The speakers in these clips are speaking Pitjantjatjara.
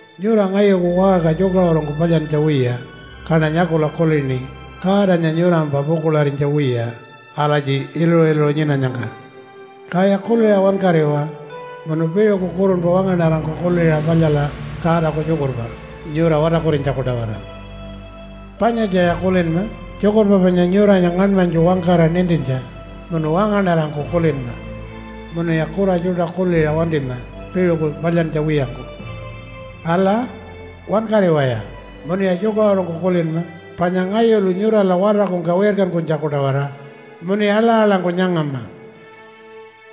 Nyura ngayuku waṟka tjukaṟurungku palyantja wiya kaṉa nyakula kulini Godanya nyurampa pukuḻarinytja wiya alatji iluṟu-iluṟu nyinanyangka. Kaya kuliṟa wankariwa munu piṟuku kurunpa wangaṉarangku kuliṟa palyala Godaku tjukurpa nyura watarkurinytjaku-tawara. Panyatjaya kulinma tjukurpa panya nyuranya ngaṉmanytju wangkara nintintja, munu wangaṉarangku kulinma. Munuya kura tjuṯa kuliṟa wantima piṟuku palyantja wiyangku. Ala, wankariwaya munuya tjukaṟurungku kulinma panya ngayulu nyurala watarkungka wirkankunytjaku-tawara, munuya aḻa-aḻangku nyangama.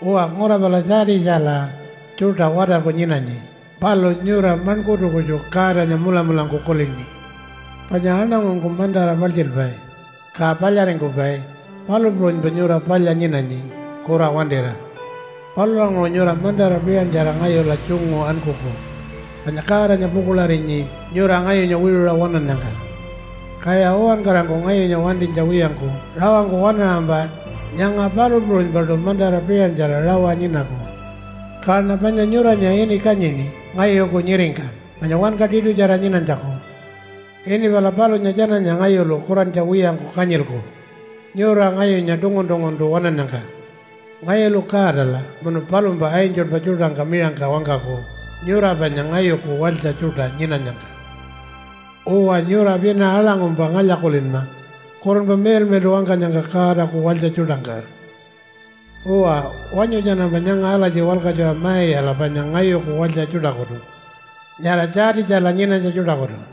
Uwa, ngura pala Tjaatitjala tjuṯa watarku nyinanyi, palu nyura maṉkurtu kutju Godanya mulamulangku kulini. Panya aṉangungku mantara paltjilpai ka palyaringkupai, palu puṟunypa nyura palya nyinanyi kura wantira. Palulanguṟu nyura mantara piṟantjara ngayula tjungu ankuku, panya Godanya pukuḻarinyi nyura ngayunya wiṟuṟa waṉannyangka. Kaya uwankarangku ngayunya wantinytja wiyangku rawangku waṉaṟampa nyanga palu puṟunypaṯu mantara piṟantjara rawa nyinaku. Kaṉa panya nyuranya ini kanyini ngayuku nyiringka panya wanka tiṯutjara nyinanytjaku. Ini pala palunya tjananya ngayulu kurantja wiyangku kanyilku nyura ngayunya tungun-tunguntu waṉannyangka. Ngayulu Godala munu palumpa angelpa tjuṯangka miṟangka wangkaku nyura panya ngayuku walytja tjuṯa nyinanyangka. Uwa, nyura pina aḻangkumpa ngalya-kulinma Kurunpa Miḻmiḻṯu wangkanyangka Godaku walytja tjuṯangka. Uwa, wanyu tjanampa nyanga alatji walkatjuṟa ma-iyala panya ngayuku walytja tjuṯakutu nyara Tjaatitjala nyinanytja tjuṯakutu.”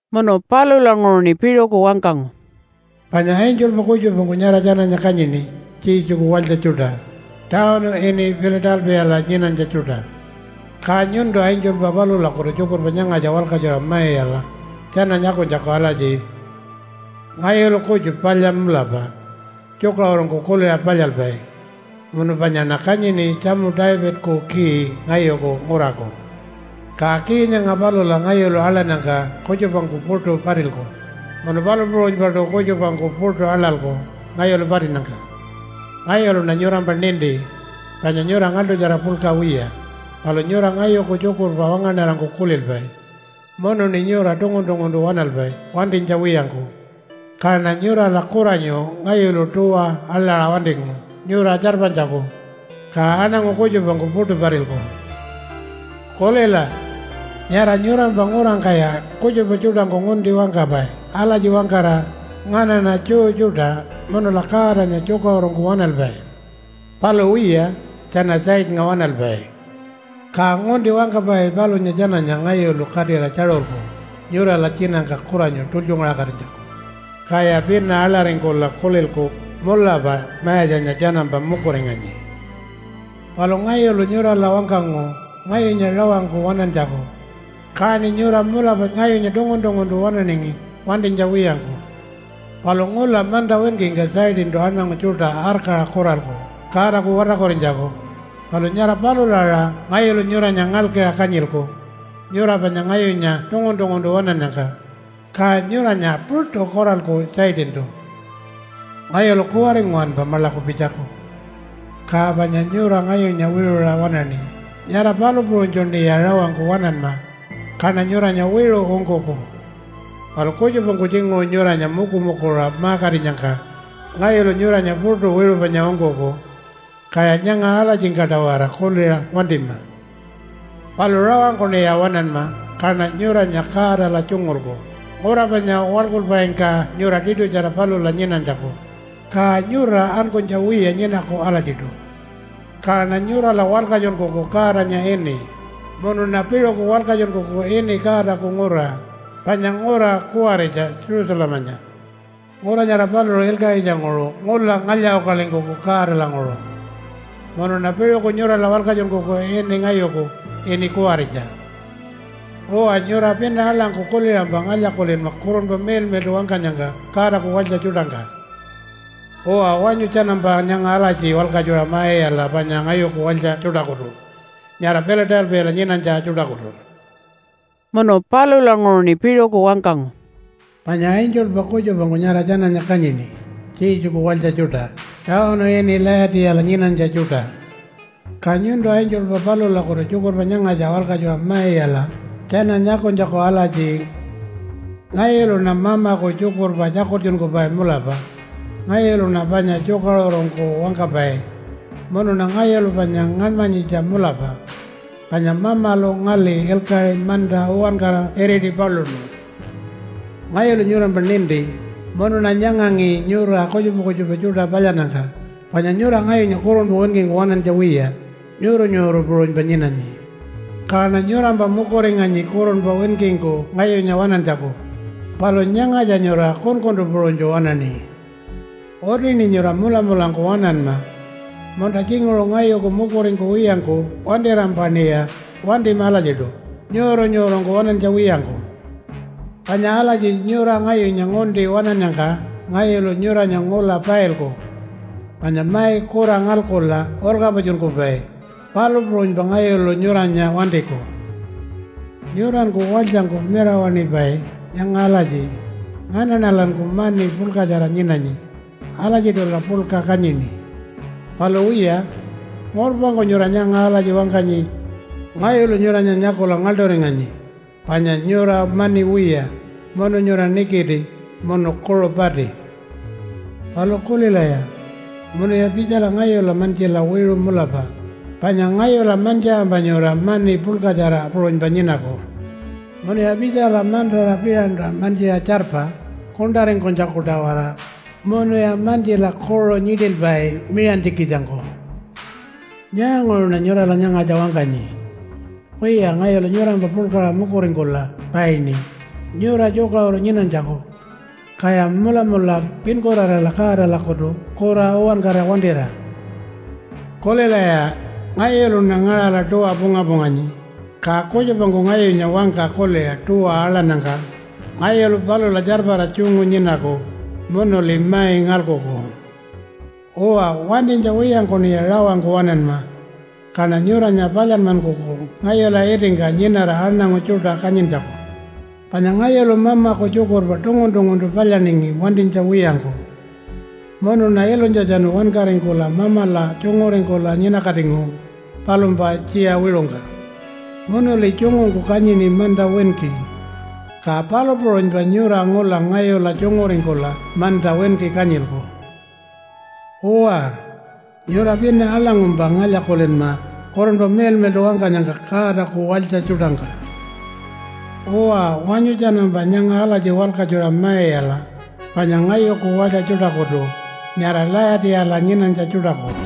Munu palulanguṟuṉi piṟuku wangkangu, “Panya angelpa kutjupangku nyara tjananya kanyini Jesuku walytja tjuṯa tawunu ini Pila-talpiyala nyinanytja tjuṯa. Ka nyuntu angelpa palulakutu tjukurpa nyangatja walkatjuṟa ma-iyala tjana nyakunytjaku alatji, Ngayulu kutju palya mulapa, tjukaṟurungku kuliṟa palyalpai munu panyaṉa kanyini tjamu Davidaku key ngayuku nguraku. Ka key nyanga palula ngayulu aḻannyangka kutjupangku puṯu patilku. Munu palu puṟunypaṯu kutjupangku puṯu aḻalku ngayulu patinnyangka. Ngayuluṉa nyurampa ninti panya nyura ngaḻṯutjara puḻka wiya. Palu nyura ngayuku tjukurpa wangaṉarangku kulilpai, munuṉi nyura tungun-tunguntu waṉalpai wantinytja wiyangku. Kaṉa nyurala kuranyu ngayulu tuwa aḻaṟa wantingu nyura tjarpanytjaku, ka aṉangu kutjupangku puṯu patilku. Kulila! Nyara nyurampa ngurangkaya kutjupa tjuṯangku ngunti wangkapai alatji wangkara, ‘Nganaṉa Jew tjuṯa, munula Godanya tjukaṟurungku waṉalpai.’ Palu wiya, tjana Satannga waṉalpai. Ka ngunti wangkapai palunya tjananya ngayulu katira tjaṟulku nyurala tjinangka kuranyu tultjungaṟakatinytjaku, kaya pina aḻaringkula kulilku, ‘Mulapa Mayatjanya tjanampa mukuringanyi.’ Palu ngayulu nyurala wangkangu ngayunya rawangku waṉantjaku, kaṉi nyura mulapa ngayunya tungun-tunguntu waṉaningi wantinytja wiyangku. Palu ngula manta winkingka Satantu aṉangu tjuṯa arkaṟa kuralku Godaku watarkurinytjaku. Palu nyara palula aṟa ngayulu nyuranya ngalkiṟa kanyilku nyura panya ngayunya tungun-tunguntu waṉannyangka, ka nyuranya puṯu kuralku Satantu. Ngayulu kuwari nguwanpa maḻaku pitjaku. Ka panya nyura ngayunya wiṟuṟa waṉaṉi, nyara palu puṟunytjuṉiya rawangku waṉanma, kaṉa nyuranya wiṟu ungkuku. Palu kutjupangku tjinguṟu nyuranya mukumukuṟa ma-katinyangka ngayulu nyuranya puṯu wiṟu panya ungkuku. Kaya nyanga alatjingka-tawara kuliṟa wantima. Palu rawangkuṉiya waṉanma kaṉa nyuranya Godala tjungulku ngura panya waḻkulpaingka nyura tiṯutjara palula nyinanytjaku. Ka nyura ankunytja wiya nyinaku alatjiṯu. Kaṉa nyurala walkatjunkuku Godanya ini, munuṉa piṟuku walkatjunkuku ini Godaku ngura, panya ngura kuwaritja Jerusalemanya. Ngura nyara paluṟu ilkaṟitjanguṟu ngula ngalya-ukalingkuku Godalanguṟu. Munuṉa piṟuku nyurala walkatjunkuku ini ngayuku, ini kuwaritja. Uwa, nyura pina aḻangku kuliṟampa ngalya-kulinma Kurunpa Miḻmiḻṯu wangkanyangka Godaku walytja tjuṯangka. Uwa, wanyu tjanampa nyanga alatji walkatjuṟa ma-iyala panya ngayuku walytja tjuṯakutu nyara Pila-talpiyala nyinanytja tjuṯakutu.” Munu palulanguṟuṉi piṟuku wangkangu, “Panya angelpa kutjupangku nyara tjananya kanyini Jesuku walytja tjuṯa tawunu ini Layatiyala nyinanytja tjuṯa. Ka nyuntu angelpa palulakutu tjukurpa nyangatja walkatjuṟa ma-iyala tjana nyakunytjaku alatji, Ngayuluṉa Mamaku tjukurpa tjakultjunkupai mulapa. Ngayuluṉa panya tjukaṟurungku wangkapai munuṉa ngayulu panya ngaṉmanyitja mulapa panya Mamalu ngali ilkaṟi manta uwankara iriti paluṉu. Ngayulu nyurampa ninti munuṉa nyangangi nyura kutjupa kutjupa tjuṯa palyannyangka, panya nyura ngayunya kurunpa winkingku waṉantja wiya nyuuru-nyuuru puṟunypa nyinanyi. Kaṉa nyurampa mukuringanyi kurunpa winkingku ngayunya waṉantjaku. Palu nyangatja nyura kunkuntu puṟunytju waṉaṉi. Utiṉi nyura mulamulangku waṉanma, munta tjinguṟu ngayuku mukuringkuwiyangku wantirampaṉiya wantima alatjiṯu nyuuru-nyuurungku waṉantja wiyangku. Panya alatji nyura ngayunya ngunti waṉannyangka ngayulu nyuranya ngula pailku. Panya mai kura ngalkula ulkapatjunkupai, palu puṟunypa ngayulu nyuranya wantiku. Nyuranku walytjangku mirawaṉipai nyanga alatji, ‘Nganaṉalanku mani puḻkatjara nyinanyi. Alatjiṯula puḻka kanyini.’ Palu wiya ngurpangku nyura nyanga alatji wangkanyi. Ngayulu nyuranya nyakula ngaḻṯuringanyi, panya nyura mani wiya, munu nyura nikiti, munu kuṟu pati. Palu kulilaya, munuya pitjala ngayula mantjila wiṟu mulapa. Panya ngayula mantjiṟampa nyura mani puḻkatjara puṟunypa nyinaku. Munuya pitjala mantara piṟanta mantjiṟa tjarpa kuṉṯaringkunytjaku-tawara. Munuya mantjila kuṟu nyiṯilpai miṟantjikitjangku. Nyaanguṟuṉa nyurala nyangatja wangkanyi? Wiya ngayulu nyurampa puḻkaṟa mukuringkula paini nyura tjukaṟuru nyinanytjaku. Kaya mulamula pinkurarala Godalakutu kura uwankara wantira. Kulilaya! Ngayuluṉa ngaṟala tuwa punga-punganyi, ka kutjupangku ngayunya wangka kuliṟa tuwa aḻannyangka ngayulu palula tjarpara tjungu nyinaku munuli mai ngalkuku. Uwa, wantinytja wiyangkuṉiya rawangku waṉanma. Kaṉa nyuranya palyanmankuku ngayula itingka nyinara aṉangu tjuṯa kanyintjaku. Panya ngayulu Mamaku tjukurpa tungun-tunguntu palyaningi wantinytja wiyangku. Munuṉa ilunytjatjanu wankaringkula Mamala tjunguringkula nyinakatingu palumpa tjiya wiṟungka. Munuli tjungungku kanyini manta winki. Ka palu puṟunypa nyura ngula ngayula tjunguringkula manta winki kanyilku. Uwa, nyura pina aḻangkumpa ngalya-kulinma Kurunpa Miḻmiḻṯu wangkanyangka Godaku walytja tjuṯangka. Uwa, wanyu tjanampa nyanga alatji walkatjuṟa ma-iyala panya ngayuku walytja tjuṯakutu nyara Layatiyala nyinanytja tjuṯaku.”